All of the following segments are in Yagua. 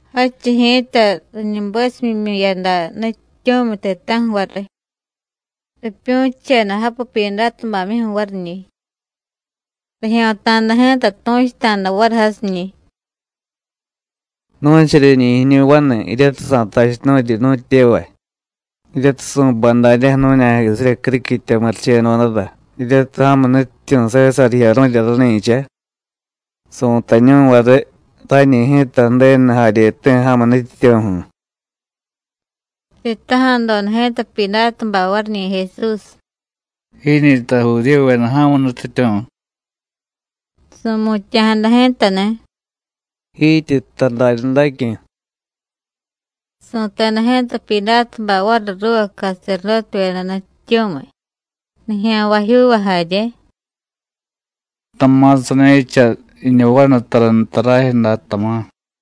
Jadchiy ji̱ta, riñubesumimyu̱yada nutyityu̱miy ti̱ta̱ju̱ variy, ripyu̱cheda japu Pyidátubamyuju̱ variñi̱. Rijyo̱ta̱da ji̱ta tu̱chuta̱da variy jasiñi̱: “Nu̱charyeñi̱ jiñu vanu, jiryatiy sa̱tachunu̱ryi nu̱tyevay, jiryatiy su̱bay daryaju̱ nu̱ña̱jisirya criquitya murichedodara jiryatiy ja̱mu nutyityu̱ Sésar jiyaru̱rya rani̱cha, su̱tañu̱y variy: Rañi ji̱ta Ju̱denu jaryeti̱ ja̱mu nutyityu̱ju̱.” Sitaja̱doda ji̱ta Pyidátubay variñi̱ Jesús: “¿Jiñi̱ta Judíyuveda ja̱mu nutyityu̱?” Su̱mutya̱jada ji̱tani̱: “Jityi jtay daryadacyu̱.” Su̱teda ji̱ta Pyidátubay variy ruuva caserdótevyeda nutyityu̱miy, nijya̱nvajyuuva jarye: “Tama̱ sani̱cha jiñu vanu tara nta rajyu̱ day, tama̱.”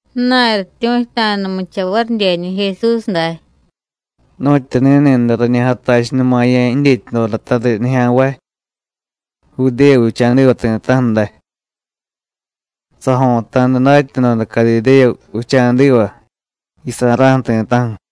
Ju̱na̱y rityu̱chuta̱numucha varidyeñi̱ Jesús day: “Nu̱tyu ni̱ni̱day rañi jatachunumaya̱ jidyetyadodata riy nijya̱nvay Judéya vicha̱diva ti̱ta̱ju̱ day. Sajo̱ta̱da datyadoda Cadidéya vicha̱diva, jiyusa̱ra̱ju̱ ti̱ta̱ju̱.”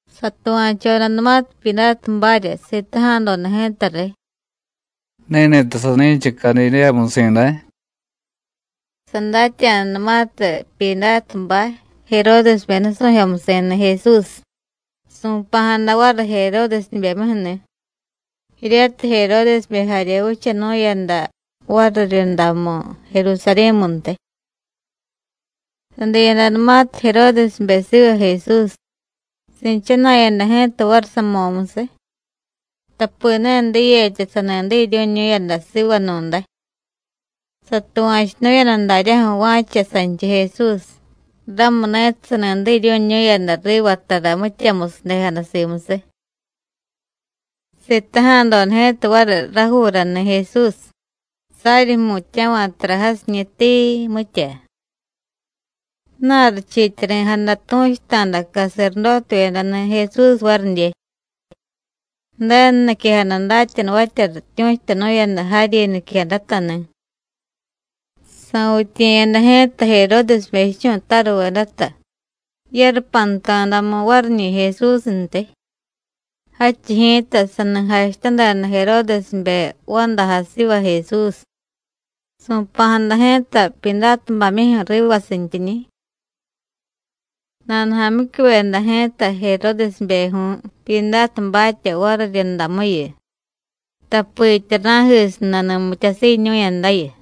Satuva̱chodanumatiy Pyidátubarya, sitaja̱doda ji̱ta riy: “¿Ni̱ni̱ta sani̱cha Cadidéyamusi̱ day?” Sadatya̱danumatiy Pyidátubay, Jeródesbe nusu̱jyomusi̱ni̱ Jesús, su̱pa̱jada variy Jeródesbemyuju̱ni̱, jiryatiy Jeródesbe jarye vichanu̱yada variryundamu Jerusarí̱muntiy. Sadiyadanumatiy Jeródesbe siva Jesús, si̱chana̱yada ji̱ta variy samo̱musiy, tapi ne diyetya sani diryu̱ñu̱yada sivanu̱day. Satuva̱chunu̱yada daryaju̱ va̱cha sanchiy Jesús, ramuni̱tiy sani diryu̱ñu̱yada riva tara mityamusiy ju̱dejada simusiy. Sitaja̱doda ji̱ta variy rajuurani̱ Jesús, saryi jmutya̱va̱ tara jasiñi̱, tii, mitya. Ju̱na̱y richiityari̱jada tu̱chuta̱da caserdótevyedani̱ Jesús varidye. Ju̱denu niquejada datyanuvatya rityu̱chutanu̱yada jaryi niquejadatani̱. Sa̱vityiye̱yada ji̱ta Jeródesbe jichu̱taruvedata yarupanta̱damu variñi̱ Jesúsntiy. Jadchiy ji̱ta, sani jachutadeda Jeródesbe vandajay siva Jesús, su̱pa̱jada ji̱ta Pyidátubamyuju̱ rivasintyiñi̱. Nanujamyicyuveda ji̱ta Jeródesbejyu̱y Pyidátubatya variryundamuyu, tapitya ra̱jisiy nani mityasiiñu̱yadayu.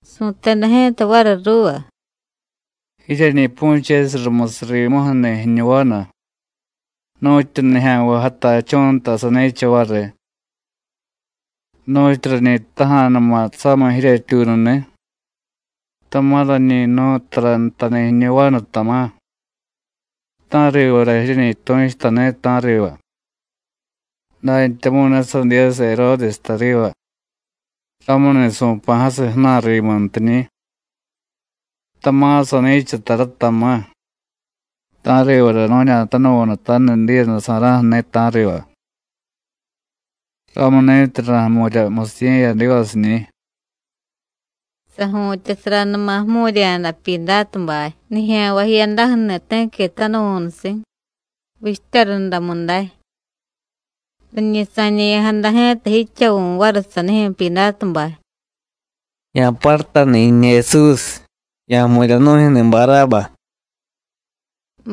Su̱teda ji̱ta variy ruuva: “Jiryeñi pu̱chesiy rumusiy rimuju̱ni̱ jiñu vanu nu̱tyu nijya̱nvay jatachú̱ nta sani̱cha variy. Nu̱tyu rañi jtaja̱numa̱ samiy jiryetyuununi̱, tama̱ rañi jnu̱y tara ntani̱ jiñu vanu, tama̱, ta̱rivara jiryeñi tu̱chutani̱, ta̱riva. Dantyamu̱y ne sadiyasiy Jeródes tariva, ramuni̱ su̱pa̱jasiy ju̱na̱y rimuntiñi̱. Tama̱ sani̱cha tara, tama̱, ta̱rivara nu̱ña̱tanuvu̱nutaniy diiyadasa̱ra̱ju̱ni̱, ta̱riva. Ramuni̱tiy ra̱jmu̱rya musiye̱yadivasiñi̱.” Saju̱tyasaranuma jmu̱rya̱da Pyidátubay, nijya̱nvay jiyadaju̱ni̱ ti̱qui tanuvu̱nusi̱, vichtya rundamu day. Riñi sa̱ñe̱ya̱jada ji̱ta jidchavu̱ variy sanijyu̱ Pyidátubay: “Ya̱parutani̱ jiñu Jesús, ya̱jmu̱rya nu̱jyu̱ni̱ Barába.”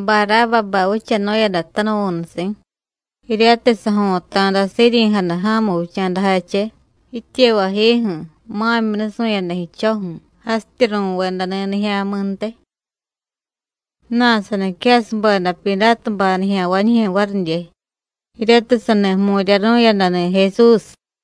Barábabay vichanu̱yada tanuvu̱nusi̱, jiryatiy sajo̱ta̱da siryi̱jada ja̱mu vicha̱dajache, jityevayjiju̱, ma̱myi nusu̱yada jidcho̱ju̱, jasityi ru̱vedani̱ nijya̱mi̱ntiy. Ju̱na̱y saniquejasubeda Pyidátubay nijya̱nvañijyu̱ varidye, jiryatiy sani jmu̱ryaru̱yadani̱ Jesús.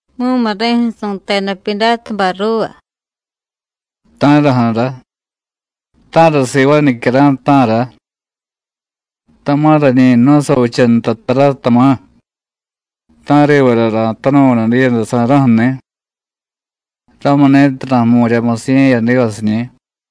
Mumuri̱ju̱ su̱teda Pyidátubay ruuva: “¿Ta̱raju̱ra? ¿Ta̱ra sivaay nicyara̱y, ta̱ra? Tama̱ rañi jnu̱y savicha nta tara, tama̱, ta̱rivara ra̱tanuvu̱nu diiyadasa̱ra̱ju̱ni̱. Ramuni̱tiy ra̱jmu̱rya musiye̱yadivasiñi̱.”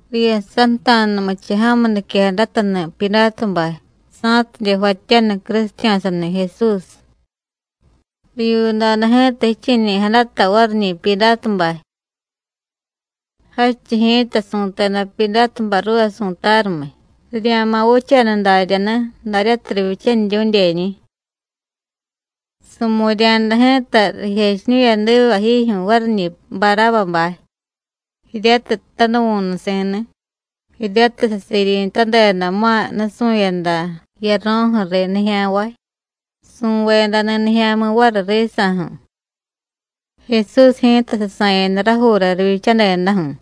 Riyasanta̱numucha ja̱mu niquejadatani̱ Pyidátubay, sa̱tidye jvatyaniy crusitya̱sani̱ Jesús. Rivyuudoda ji̱ta jiche̱ñe̱ya̱jadata variñi̱ Pyidátubay. Jadchiy ji̱ta, su̱teda Pyidátubay ruuva su̱tarumiy, rirya̱ma̱ vichaniy daryani̱, daryatiy rivyichaniryu̱dyeñi̱. Su̱mu̱rya̱da ji̱ta rijechiñu̱yadiva jijyu̱ variñi̱ Barábabay, jiryatiy tanuvu̱nusi̱ni̱, jiryatiy sasiryi̱tadeda ma̱y nusu̱yada jiyaro̱ju̱ riy nijya̱nvay, su̱vedani̱ nijya̱mi̱ variy risa̱ju̱. Jesús ji̱ta sasa̱yada rajuura rivyichadedaju̱.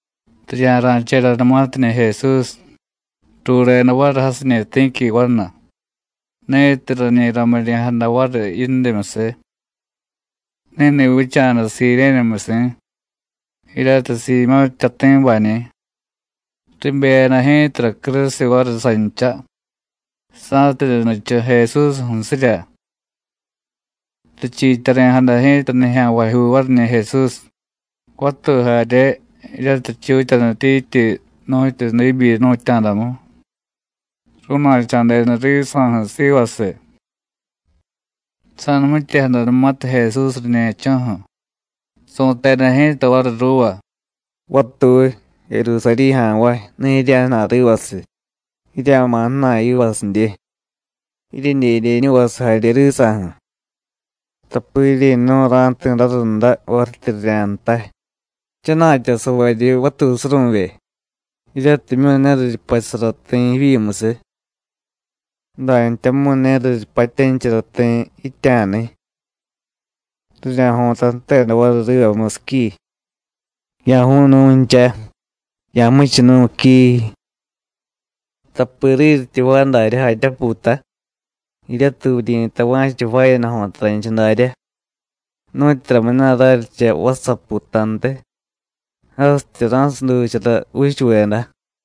Rirya̱ra̱chedanumatiñi̱ Jesús, rureda variy jasiñi̱ ti̱qui vanu, ni̱tiy rañi ramiryi̱jada variy yindimyusiy. Ni̱ni̱ vicha̱da Sirénemusi̱, jiryatiy Siimyó̱ jtyati̱bañi̱. Ribeyada ji̱tara crusiy variy sancha, sa̱tidye nichu Jesús ju̱sirya. Richiityari̱jada ji̱ta nijya̱nvajyuu variñi̱ Jesús, vatuy jarye, jiryatiy richutyanityityi nu̱tyu diibyi jnu̱tya̱damu, ru̱na̱cha̱deda risa̱ju̱ sivasiy. Sa̱numityejadanumatiy Jesús riñe̱cho̱ju̱, su̱teda ji̱ta variy ruuva: “Vatuy, Jerusarí̱ ja̱nvay, ne jirya̱jna̱y rivasiy. Jirya̱ma̱ ju̱na̱y yivasidye, jiryedyedyeñuvasiy jarye risa̱ju̱, tapi jiryi̱nu̱y, ra̱jti̱ rarunda varityi rirya̱jtay: Jchana̱tyasavaryi vatuy suru̱vye, jiryatimyu̱ ne riryupachusara ti̱ jivyimusiy, dantyamu̱y ne riryupatyanichara ti̱ yitya̱niy. Rirya̱jo̱ta jteda variy riva musiqui: ¡Ya̱ju̱u̱y nu̱ncha, ya̱jmuchunu̱y quiii! Tapi riryityi jvaay daryá jatyápuuta (jiryatiy vuryi̱tay va̱cha jvaayada jo̱taranchiy daryá), nu̱tyuramuna̱ raryicha vassaputantiy (jasityi ra̱suduchara juuchuveda).”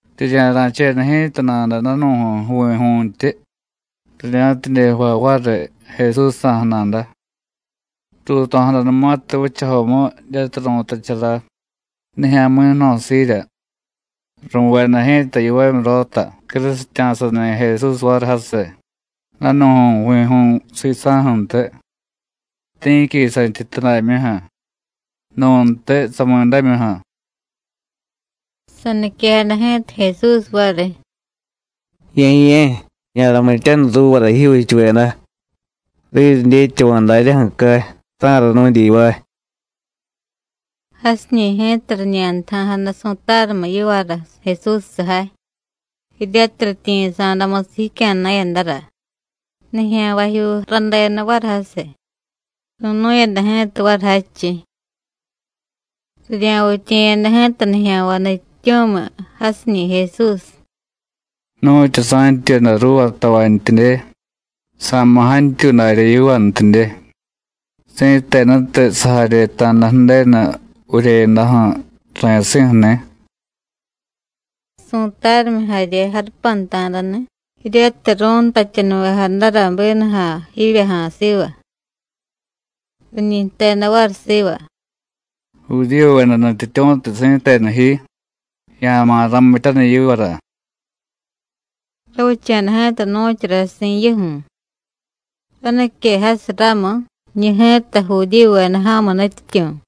Rirya̱ra̱cheda ji̱ta nada danu̱ju̱y jvi̱ju̱ntyi, rirya̱tidye jvay variy Jesúsjsa̱ju̱ nada. Ruuto̱jadanumatiy vichajomu, jiryatiy ru̱tachara: Nijya̱mi̱ Jno̱siirya, ru̱veda ji̱ta yivamyurota crusitya̱sani̱ Jesús variy jasiy, danu̱ju̱y jvi̱ju̱y sisa̱ju̱ntiy, ti̱qui santyityudamyuju̱, nu̱ntiy samidámyuju̱. Saniquejada ji̱ta Jesús variy: “Ye̱ye̱, ya̱ramityaniy ruuvara jijyuuchuveda, riryidyetyava̱ daryaju̱ cay: ta̱ra nu̱dyivaay.” Jasiñi̱ ji̱ta riñantaja̱jada su̱tarumiy yivara Jesús sujay, jiryatiy rityiyi̱sa̱damusiy jicya̱na̱yadara. Nijya̱nvajyuu radeda variy jasiy, ru̱nu̱yada ji̱ta variy jadchiy. Rirya̱vityiye̱yada ji̱ta nijya̱nvay nutyityu̱miy jasiñi̱ Jesús: “¡Nu̱tyu sa̱ntyuyada ruuva tavantyidye, sa̱ma̱ jantyuy darya yivantidye, si̱tenutiy sajaryeta̱da Ju̱denu vuryeyadaju̱ ra̱yasi̱ju̱ni̱!” Su̱tarumiy jarye jarupanta̱dani̱, jiryatiy ru̱ntatyanuvejadara bínuja̱ jivyaja̱a̱ siva. Riñi jteda variy siva: “¡Judíyuveda nutyityu̱tiy si̱tenu ji, ya̱ma̱ ramityaniy yivara!” Ravicha̱da ji̱ta nu̱chara si̱nyuju̱, ranique jasiy ramu: “Jiñu ji̱ta Judíyuveda ja̱mu nutyityu̱.”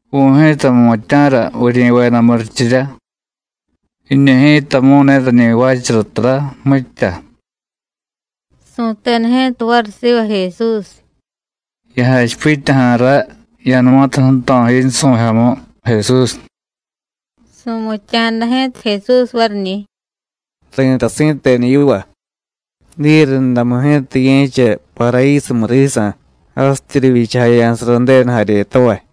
Vu̱y ji̱ta jmutya̱ra vuryi̱veda murichirya; jiñu ji̱tamu̱y ne rañi jvaachara tara, mitya.” Su̱teda ji̱ta variy siva Jesús: “¡Ya̱jachipityaja̱ ray, ya̱numatiy ju̱to̱ yinsu̱jyomu, Jesús!” Su̱mutya̱jada ji̱ta Jesús variñi̱: “Ri̱tay si̱tenu yiva: Diyerundamu ji̱ta ye̱cha Parayísumu risa̱, jasityi rivyichajaya̱sara Ju̱denu jaryetavay.”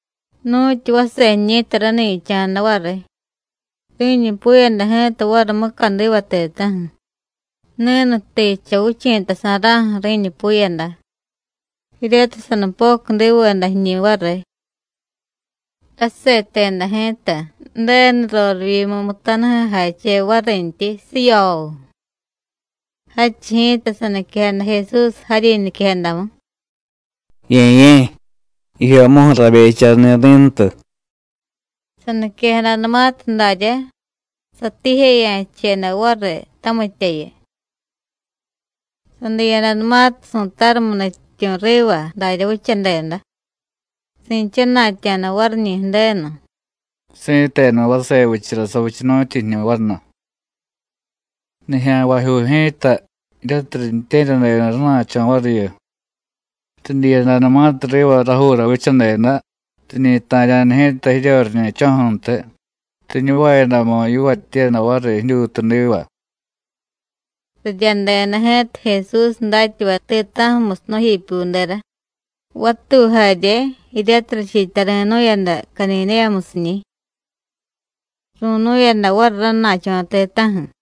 Nu̱tyu vase jiñi̱ta rani̱cha̱da variy, ri̱ñupuyada ji̱ta variy mucadiva ti̱ta̱ju̱, ni̱nutijcha vichi̱tasa̱ra̱ju̱ ri̱ñupuyada, jiryatiy sanupocudiveda jiñi̱ variy. Raseteda ji̱ta Ju̱denu rorivyimu mutanujay jache varintyi, ¡siyooo! Jadchiy ji̱ta, saniquejada Jesús jaryi niquejadamu: “¡Ye̱ye̱, jijyomuju̱ rabecharani̱ ri̱ntu!” Saniquejadanumatiy darya, satiijeya̱cheda variy tamityayu. Sadiyadanumatiy su̱tarumiy nutyityu̱ riva darya vichadeda, si̱chana̱tya̱da variñi̱ Ju̱denu: “¡Si̱tenu vase vichara savichanu̱tyi jiñu vanu!” Nijya̱nvajyuu ji̱ta, jiryatiy riintye̱ryadeda rana̱cho̱ variyu, ridyiyadanumatiy riva rajuura vichadeda, riñi ta̱rya̱da ji̱ta jiryoriñe̱cho̱ju̱ntiy, riñuvayadamu yivatyiyada variy jidyutudiva. Riryadeda ji̱ta Jesús datyavay ti̱ta̱ju̱musiy nu̱jipyudera, vatuy jarye, jiryatiy richiityari̱nu̱yada Cadidéyamusiñi̱. Ru̱nu̱yada variy rana̱cho̱ ti̱ta̱ju̱.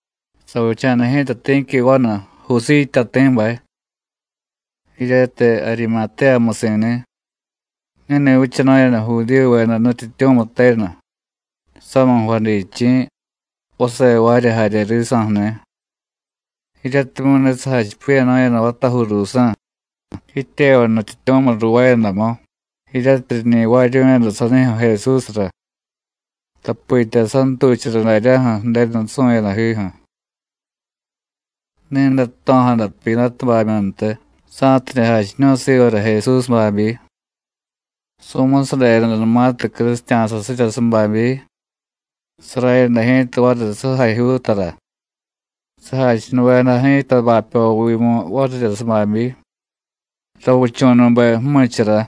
Savicha̱da ji̱ta ti̱qui vanu, Jusíy jtyati̱bay, jiryatiy Arimatéyamusi̱ni̱. Ni̱ni̱ vichanu̱yada Judíyuveda nutyityu̱miy tenu, samiy jvadichi̱, vase jvaarya jarye risa̱ju̱ni̱, jiryatimyu̱ ne sajachipiya̱nu̱yada vatajuu ruusa̱ jityevay nutyityu̱miy ruuvaayadamu, jiryatiy riñi jvaaryu̱yada sanijyu̱ Jesúsra, tapitya santuchara daryaju̱ Ju̱denu nusu̱yadajiju̱. Ni̱day jto̱jada Pyidátubamyuntiy, sa̱tidye jachiñu̱y sivara Jesús babyi. Su̱musadedanumatiy crusitya̱sasirya sababyi, sarayada ji̱ta variy sujajyuutara, sajachunuvejada ji̱ta bapyovimu varirya sababyi, ravichu̱nube ju̱michara,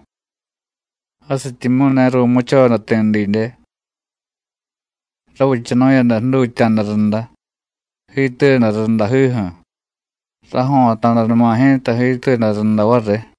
jasityimyu̱ ne ru̱muchoda ti̱ didye. Ravichanu̱yada jdutya̱da runda, jiituyada rundajiju̱. Rajo̱ta̱danuma ji̱ta jiituyada runda variy.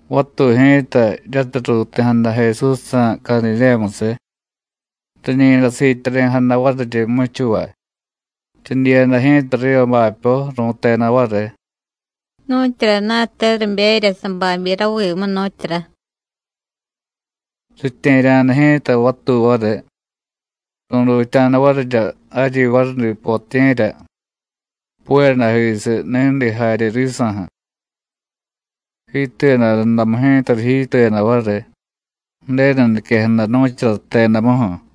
Vatuy ji̱ta, jiryatiy ruuti̱jada Jesúsjsa̱ Cadidéyamusiy, riñi̱day siityari̱jada variryi jmuchuvay, ridyiyada ji̱ta riva bapyo, ru̱teda variy: “Nu̱tyurana̱te riberya sababyi ravimu, nu̱tyura.” Ritye̱rya̱da ji̱ta vatuy variy, ru̱dutya̱da varirya jaryi varudi potiye̱rya, puyadajisiy ni̱di jarye risa̱ju̱. Jiituyada rundamu ji̱ta rijiituyada variy Ju̱denu niquejada nu̱chara jtedamuju̱.